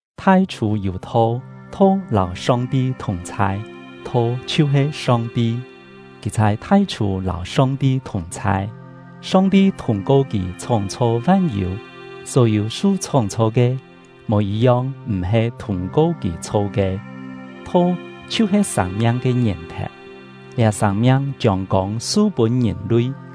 Thai-chhû yû Tho, Tho lâu Song-ti thùng-chhai, Tho chhiu-he Song-ti. Kì chhai thai-chhû lâu Song-ti thùng-chhai. Song-ti thûng-ko kì chhóng-chho van-yû; só-yû su chhóng-chho ke, mò yit-yong m̀-he thûng-ko kì chho ke. Tho chhiu-he sâng-miang ke ngièn-thèu, liá sâng-miang chiông kông su-pûn ngìn-lui.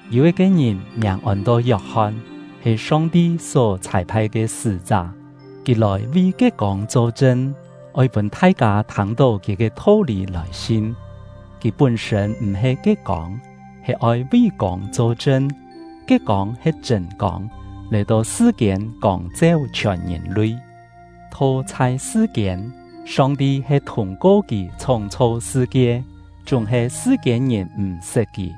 Yû yit-ke ngìn, miàng ôn-to Yok-hon, he Song-ti só chhâi-phai ke sṳ́-chá. Kì lòi vi ke kông cho-chṳn, oi pûn thai-kâ thâng-tó kì ke tho-lî lòi sin. Kì pún-sṳ̂n m̀-he ke kông, he oi vi kông cho-chṳn. Ke kông he chṳ̂n kông, lòi-to sṳ-kiên kông-cheu chhiòn ngìn-lui. Tho chhai sṳ-kiên, Song-ti he thûng-ko kì chhóng-chho sṳ-kie, chúng-he sṳ-kiên-ngìn m̀-sṳt kì.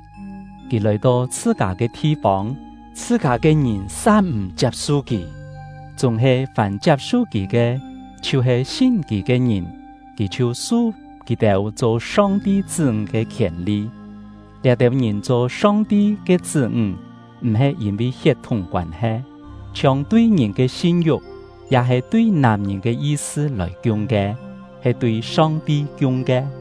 Kì lòi-to chhṳ-kâ ke thi-fông, chhṳ-kâ ke ngìn sa m̀ chiap-su kì. Chúng-he fàm chiap-su kì ke, chhiu-he sin kì ke ngìn, kì chhiu su kì-têu cho Song-ti chṳ́-ńg ke khièn-li. Liá-têu ngìn cho Song-ti ke chṳ́-ńg m̀-he yîn-vi hiet-thúng koân-he, chhiong tui ngìn ke sin-yu̍k ya-he tui nàm-ngìn ke yi-sṳ lòi kiung ke, he tui Song-ti kiung ke.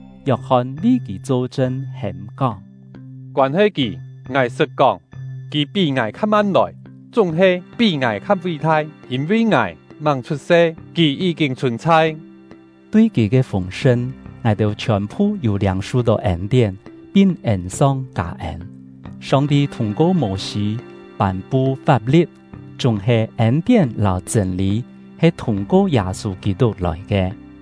Yok-hon vi kì cho-chṳn, hêm-kóng: “Koân-he kì, ngài sṳt kóng: ‘Kì pí ngài kha-man lòi, chúng-he pí ngài kha ví-thai; yîn-vi ngài màng chhut-se, kì yí-kîn chhùn-chhai.’” Tui kì ke fûng-sṳn, ngài-têu chhiòn-phu yû liâng-su-tó ên-tién, pin ên-song kâ-ên. Song-ti thûng-ko Mô-sî pân-pu fap-li̍t, chúng-he ên-tién lâu chṳ̂n-lî he thûng-ko Yâ-sû Kî-tuk lòi ke.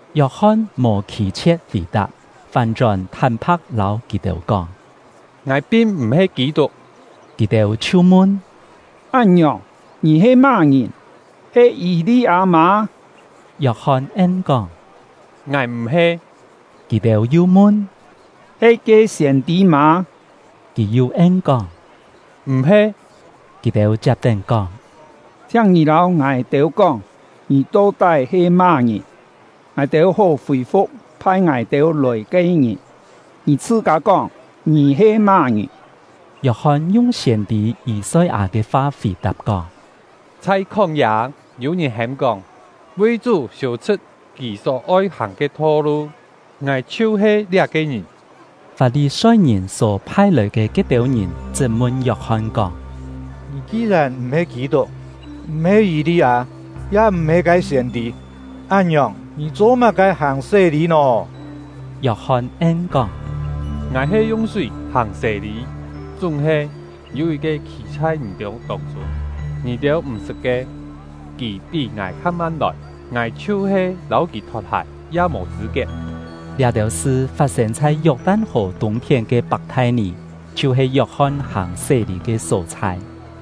Yok-hon mò khî-chhie̍t fì-tap, fán-chón thán-pha̍k lâu kì-têu kóng: “Ngài pin m̀-he Kî-tuk.” Kì-têu chhiu mun: “Án-ngiòng, ngì he má-ngìn? He Yî-li-â mâ?” Yok-hon en-kóng: “Ngài m̀-he.” Kì-têu yu mun: “He ke siên-tî mâ?” Kì yu en-kóng: “M̀-he.” Kì-têu chiap-tén kóng: “Chhiáng ngì lâu ngài-têu kóng, ngì to-tái he má-ngìn, ngài-têu hó fì-fu̍k phai ngài-têu lòi ke ngìn. Ngì chhṳ-kâ kóng, ngì he má-ngìn?” Yok-hon yung siên-tî Yî-soi-â ke fa fì-tap, kóng: “Chhai khóng-yâ yû ngìn hêm-kóng: ‘Vi Chú siû-chhṳ̍t Kì só-oi hàng ke tho-lu!’ Ngài chhiu-he liá-ke ngìn.” Fap-li-soi-ngìn só phai-lòi ke ke-têu ngìn chṳt-mun Yok-hon kóng: “Ngì ki-yèn m̀-he Kî-tuk, m̀-he Yî-li-â, ya m̀-he ke siên-tî, án-ngiòng, ngì cho-má-ke hàng sé-lî nò?” Yok-hon en-kóng: “Ngài he yung súi hàng sé-lî; chúng-he yû yit-ke khî chhai ngì-têu tông-chûng, ngì-têu m̀-sṳt ke, kì pí ngài kha-man lòi, ngài chhiu-he lâu kì thot-hài ya mò chṳ̂-kiet.” Liá-têu sṳ fat-sên chhai Yok-tan-hò tûng-phién ke Pak-thai-nì, chhiu-he Yok-hon hàng sé-lî ke só-chhai.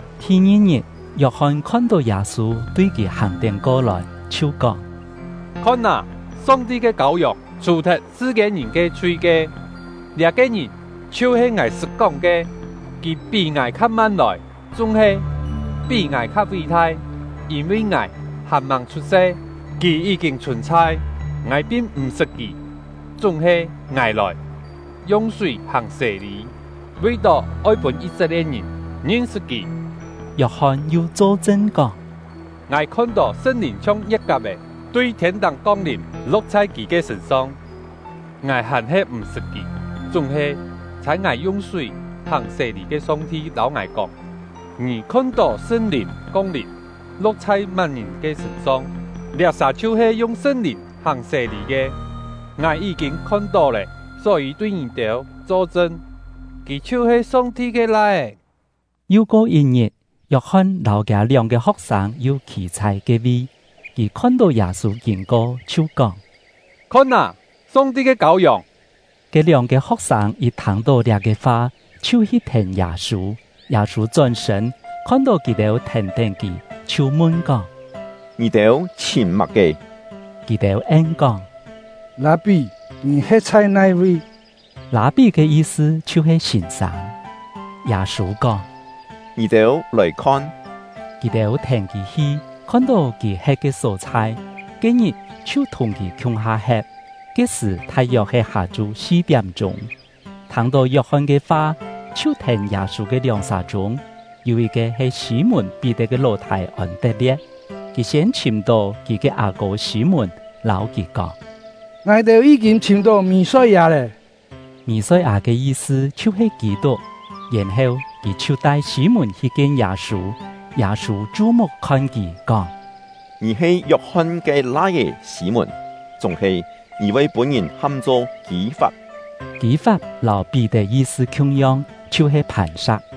Thi-ngi-ngit, Yok-hon khon-tó Yâ-sû tui kì hàng-tén ko-lòi, chhiu kóng: “Khon â, Song-ti ke Kâu-yòng, chhù-thet sṳ-kiên-ngìn ke chhui ke! Liá-ke ngìn chhiu-he ngài sṳt kóng ke: ‘Kì pí ngài kha-man lòi, chúng-he pí ngài kha ví-thai; yîn-vi ngài hàn-màng chhut-se, kì yí-kîn chhùn-chhai.’ Ngài pin m̀-sṳt kì; chúng-he ngài lòi, yung súi hàng sé-lî, vi-tó oi pûn Yî-set-lie̍t-ngìn ngin-sṳt kì.” Yok-hon yu cho-chṳn kóng: “Ngài khon-tó Sṳn-Lìn chhiong ngie̍t-kap-è tui thiên-táng kong-lìm, lo̍k chhai kì ke sṳ̂n-song. Ngài hàn-he m̀-sṳt kì, chúng-he chhâi ngài yung súi hàng sé-lî ke Song-ti lâu ngài kóng: ‘Ngì khon-tó Sṳn-Lìn kong-lìm, lo̍k chhai má-ngìn ke sṳ̂n-song, liá-sà chhiu-he yung Sṳn-Lìn hàng sé-lî ke.’ Ngài yí-kîn khon-tó lé, só-yî tui ngì-têu cho-chṳn, kì chhiu-he Song-ti ke Lai-é.” Yu ko yit-ngit, Yok-hon lâu kiâ lióng-ke ho̍k-sâng yu khî chhai ke-vi; kì khon-tó Yâ-sû kîn-ko, chhiu kóng: “Khon â, Song-ti ke Kâu-yòng!” Ke lióng-ke ho̍k-sâng yit thâng-tó liá-ke fa, chhiu hi thèn Yâ-sû. Yâ-sû chón-sṳ̂n, khon-tó kì-têu thèn-tén kì, chhiu mun-kóng: “Ngì-têu chhìm má-ke?” Kì-têu en-kóng: “Lâ-pí, ngì he̍t chhai nai-vi?” (“Lâ-pí” ke yi-sṳ chhiu-he “Sîn-sâng”.) Yâ-sû kóng: “Ngì-têu lòi khon!” Kì-têu thèn kì hi, khon-tó kì he̍t ke só-chhai, ke-ngit chhiu thùng kì khiung-ha he̍t. (Ke-sṳ̀ thai-yok he hâ-chu si-tiám-chûng.) Thâng-tó Yok-hon ke fa chhiu thèn Yâ-sû ke lióng-sà chûng, yû yit-ke he Sî-mùn-Pí-tet ke ló-thâi Ôn-tet-lie̍t. Kì siên chhìm-tó kì ke â-kô Sî-mùn, lâu kì kóng: “Ngài-têu yí-kîn chhìm-tó Mì-soi-â lé.” (“Mì-soi-â” ke yi-sṳ chhiu-he “Kî-tuk”.) Yèn-heu kì chhiu tai Sî-mùn hi kien Yâ-sû. Yâ-sû chu-muk khon kì, kóng: “Ngì he Yok-hon ke lai-é Sî-mùn, chúng-he ngì voi pûn-ngìn ham-cho Kî-fap.” (Kî-fap lâu Pí-tet yi-sṳ khiung-yong, chhiu-he “Phàn-sa̍k”.)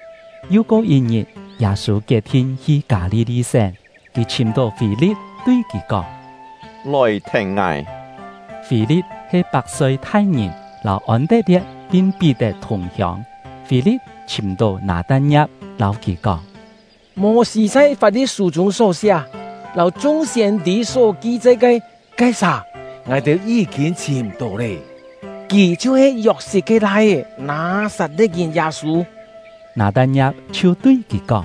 Yu ko yit-ngit, Yâ-sû kiet-thin hi Kâ-li-li-sén. Kì chhìm-tó Fî-li̍t, tui kì kóng: “Lòi thèn ngài!” (Fî-li̍t he Pak-soi-thai-ngìn, lâu Ôn-tet-lie̍t pin Pí-tet thùng-hiông.) Fî-li̍t chhìm-tó Nâ-tan-ngia̍p, lâu kì kóng: “Mô-sî chhai Fap-li̍t-sû chûng só siá lâu chung siên-tî só ki-chai ke ke-sà, ngài-têu yí-kîn chhìm-tó lé. Kì chhiu-he Yok-sit ke lai-é, Nâ-sat-le̍t-ngìn Yâ-sû.” Nâ-tan-ngia̍p chhiu tui kì kóng: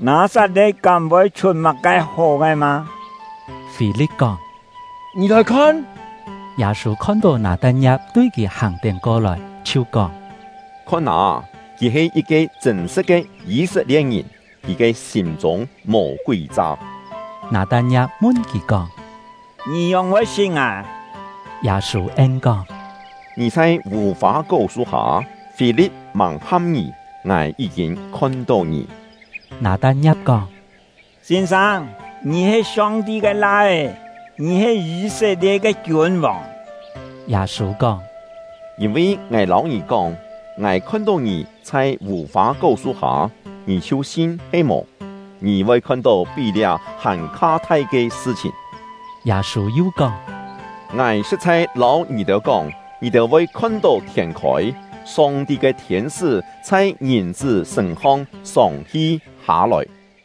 “Nâ-sat-le̍t kám voi chhut má-ke hó ke mâ?” Fî-li̍t kóng: “Ngì lòi khon!” Yâ-sû khon-tó Nâ-tan-ngia̍p tui kì hàng-tén ko-lòi, chhiu kóng: “Khon â, kì he yit-ke chṳ̂n-sṳ̍t ke Yî-set-lie̍t-ngìn; kì ke sîm-chûng mò kúi-cha!” Nâ-tan-ngia̍p mun kì kóng: “Ngì ngióng-voi sṳt ngài?” Yâ-sû en-kóng: “Ngì chhai vù-fâ-kó su-hâ, Fî-li̍t màng ham ngì, ngài yí-kîn khon-tó ngì.” Nâ-tan-ngia̍p kóng: “Sîn-sâng, ngì he Song-ti ke Lai-é; ngì he Yî-set-lie̍t ke kiûn-vòng!” Yâ-sû kóng: “Yîn-vi ngài lâu ngì kóng, ngài khon-tó ngì chhai vù-fâ-kó su-hâ, ngì chhiu sin he-mò? Ngì voi khon-tó pí liá hàn-kha thai ke sṳ-chhìn!” Yâ-sû yu kóng: “Ngài sṳ̍t-chhai lâu ngì-têu kóng, ngì-têu voi khon-tó thiên khôi, Song-ti ke thiên-sṳ́ chhai Ngìn-chṳ́ sṳ̂n-hong sông-hi hâ-lòi.”